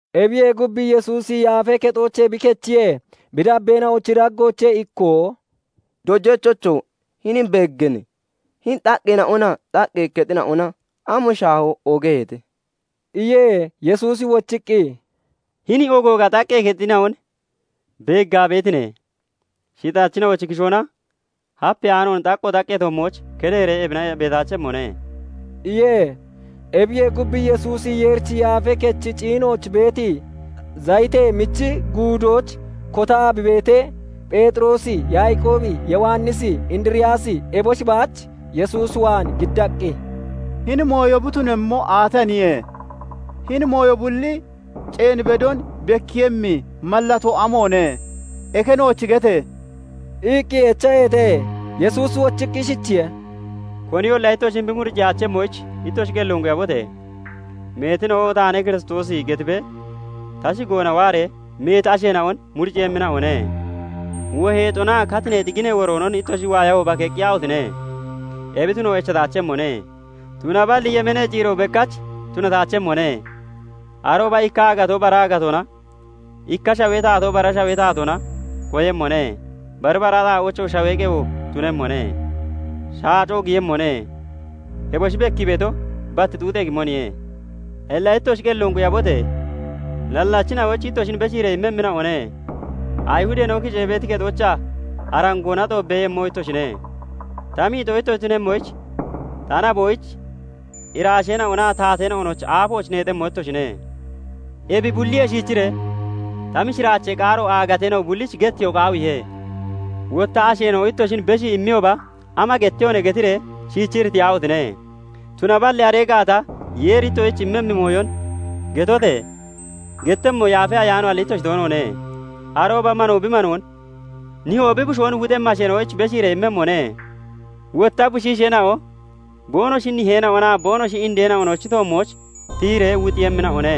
Ebiyee gub, Yesuusi Yaafee Kexoochee bi kechiyee, bi dabbeena'ochi daggoochee ikkoo "Dojachocho! Hinin beegganne? Hini xaqqeena'onaa xaqqee kexina'ona am shaaho ogoogaheete!" iye. Yesuusi wochiqqi, "Hini ogooga xaqqee kexina'on beeggaa beetine? Shixachina'ochi kishoona hapeyaanoon xaqqo xaqqee toommooch keddeeree ebina beetaachemmoone" iye. Ebiyee gub, Yesuusi Yeerichi Yaafee Kechi ciinooch beeti Zayitee Michi Guudooch kotaa bi beetee, Pheexiroosi, Yaaqoobi, Yowannisi, Indiriyaasi eboshi baach Yesuus waan giddaqqi, "Hini mooyo bi tunemmo aataniye? Hini mooyo bulli ceen bedon bekkiiyemmi mallatoo amoone? Eke nooch gete!" iqqi echaheete. Yesuusi wochiqqi ishichiye:- "Koniyolla ittoshin muciyaachemmoyich ittoshi qelloon quyabote! Meetina'o 'Taane Kiristoosi' getibee ta shigoona waaree meeti asheena'on muriciiyemmina'one. Woheexonaa katineexi ginee woroonon ittoshi waayahooba keqqiyaahotine! Ebi tuno echataachemmone; tunaballi yemeenee ciiro bekkach tunataachemmone. Arooba ikka aagatoo bara aagatoona, ikka shawee taatoo bara shawee taatoona koyemmone; bari bara xaa'oochoo shawee qewo tunemmone; shaacoo giyemmone. Eboshi bekkii beeto bat xuuxee gimoniye. "Illa ittoshi qelloon quyabote! Nallachina'oyich ittoshin beshiiree immemmina'one; Ayihudeena'o kicee beeti kexoochaa arangoona xoobbeeyemmo ittoshine; ta miixoo ittoshi tunemmoyich ta naboyich iraasheena'onaa taateena'onochi aafooch neexemmo ittoshine. Ebi bulliyee shiichiree ta mishiraachee qaaro aagateena'o bullich getteyoo qaawiihe. Wotta asheena'o ittoshin beshii imiyooba, 'Ama gettehone?' getiree shiichi iritiyaahotine! Tunaballi aree gaata Yeeri ittoshich immimmi mooyon getote! Gettemmo Yaafa Ayaanoalli ittoshi toonoone. "Arooba manoo bi manoon, nihoo bi bushoon wuxemmi asheena'oyich beshiiree immemmone; wotta bushiisheena'o boonoshi niheena'onaa boonoshi indeena'onochi toommooch tiyiree wuxiiyemmina'one.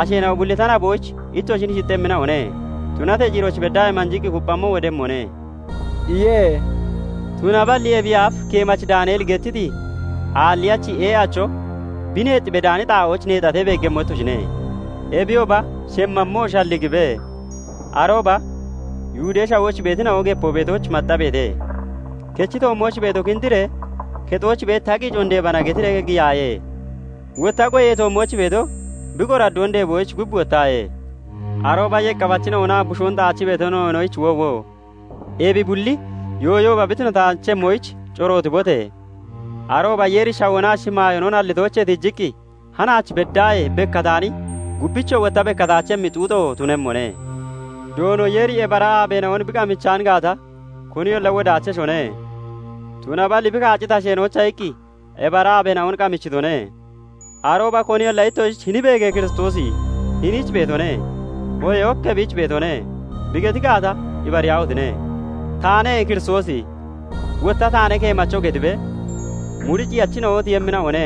Asheena'o bulli ta naboyich ittoshin shixxemmina'one; tunatee ciirooch beddaahee manjiqqi kupphammo wodemmone" iye. "Tunaballi [ebiyee aaf keemachi Daaneli gettiti] aalliyachi ee'acho bi neex bedaani xaa'ooch neexatee, beeggemmo ittoshine. Ebiyooba shemmammoo shalligibe; arooba Yihudee Shawooch beetina'o gepoo beetooch maxxabeete. Kechi toommooch beeto 'Kindiree kexooch beeti ta qiicoon deebana' getiree giyaaye. Wotta goyee toommooch beeto bi qoraddoon deeboyich gub wottaaye. Arooba yeqqafachina'onaa bushoon xaachii beetina'onoyich woowo! Ebi bulli yooyooba bi tunataachemmoyich corootibote! Arooba Yeeri shawoonaa shimaayoonon hallitoochee tiijiqqi hanaach beddaahee bekkataani, gubbichoo wotta bekkataachemmi xuuxo tunemmone. Doono Yeeri ebi ara aabeena'on bi qamichaan gaata, koniyolla wodaacheshone; tunaballi bi kaacciti asheena'oyicha iqqi ebi ara aabeena'on qamichitone. Arooba koniyolla ittoshich 'Hini beege! Kiristoosi hiniich beetone', oohee 'Ok ebiich beetone' bi geti gaata, ibariyaahotine! 'Taane Kiristoosi', wotta 'Taane keemacho' getibee muriciiyachina'o tiyemmina'one.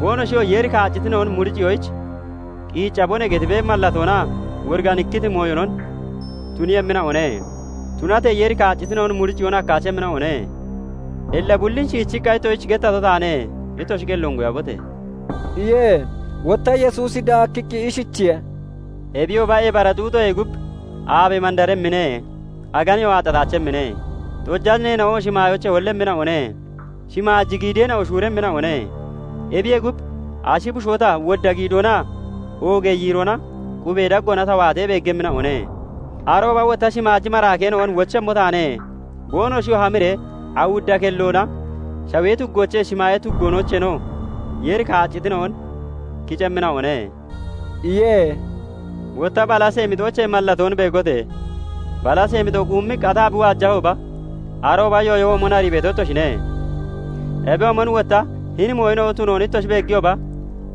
Boonoshiyoo 'Yeeri kaaccitina'on muriciyoyich qiiccabone' getibee mallatoonaa woriganikkiti mooyonon tuniiyemmina'one; tunatee Yeeri kaaccitina'on muriciyoon hakkaachemmina'one. Illa bullin shiichiqqa ittoshich gettato taane; ittoshi qelloon quyabote!" iye. Wotta Yesuusi daakkiqqi ishichiye:- "Ebiyooba ebi ara xuuxoyee gub, 'Aabe mandaremmine; aganeyoo aaxxataachemmine; xojaneena'o shimaayoochee hollemmina'one; shimaaji giideena'o shuuremmina'one' Ebiyee gub, ashi bushoo ta wodda giidoonaa oogee yiiroona 'Qubee daggoona ta waatee' beeggemmina'one. Arooba tawoo shimaaji maraakeena'on wochemmo taane; boonoshiyoo hamiree awudda kelloona shawee tuggoochee, shimaayee tuggoocheenoo Yeeri kaaccitina'on kicemmina'one" iye. "Wotta balasee mixoochee mallatoon beegote! Balasee mixo quummiqqi ataa bi waajahooba arooba yooyo womon arii beeto ittoshine. Ebiyoomon wotta hini mooyina'o tunoon ittoshi beegiyooba,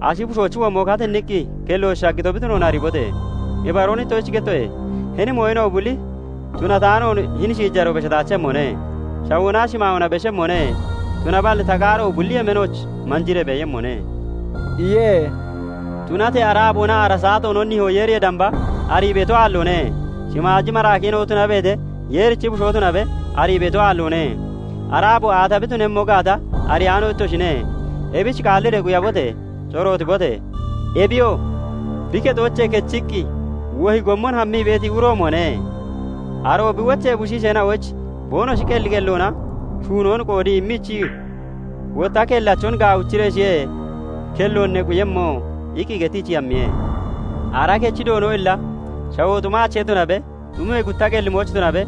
ashi bushoochi womo katinniqqi kelloch shaggito bi tunoon ariibote! Ibaroon ittoshich gettoye; hini mooyina'o bulli tunataanoon hini shiijaroo beshataachemmone. Shawoonaa shimaayoona beshemmone; tunaballi ta qaaro bulli yemeenooch manjiree beeyemmone" iye. Tunatee ara aaboonaa ara saatoonon nihoo Yeeriyee damba arii beeto aalloone. Shimaaji maraakeena'o tunabeete, Yeerichi Bushoo tunabe, arii beeto aalloone. Ara aabo aata bi tunemmo gaata ariyaano ittoshine. Ebich qaalliree quyabote! [Corootibote!] Ebiyoo bi kexoochee kechiqqi wohi gommon hammii beeti uroomone. Aroo bi wochee bushiisheena'oyich boonoshi qelli qelloona shuunoon qoodii immiichii wotta kellachon 'Gaawichireeshiye kelloon ne quyemmo' iqqi gettiichii hammiye. "Ara kechi Doono illa shawoo xumaache tunabe, xumee gutta qellimooch tunabe,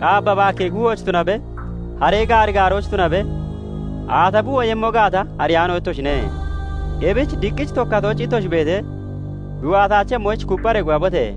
qaabba baakkee kuuhooch tunabe, haree gaari gaarooch tunabe, aata bi woyemmo gaata ariyaano ittoshine. Ebich diqqich tokkatooch ittoshi beetee, bi waataachemmoyich kuppharee quyabote!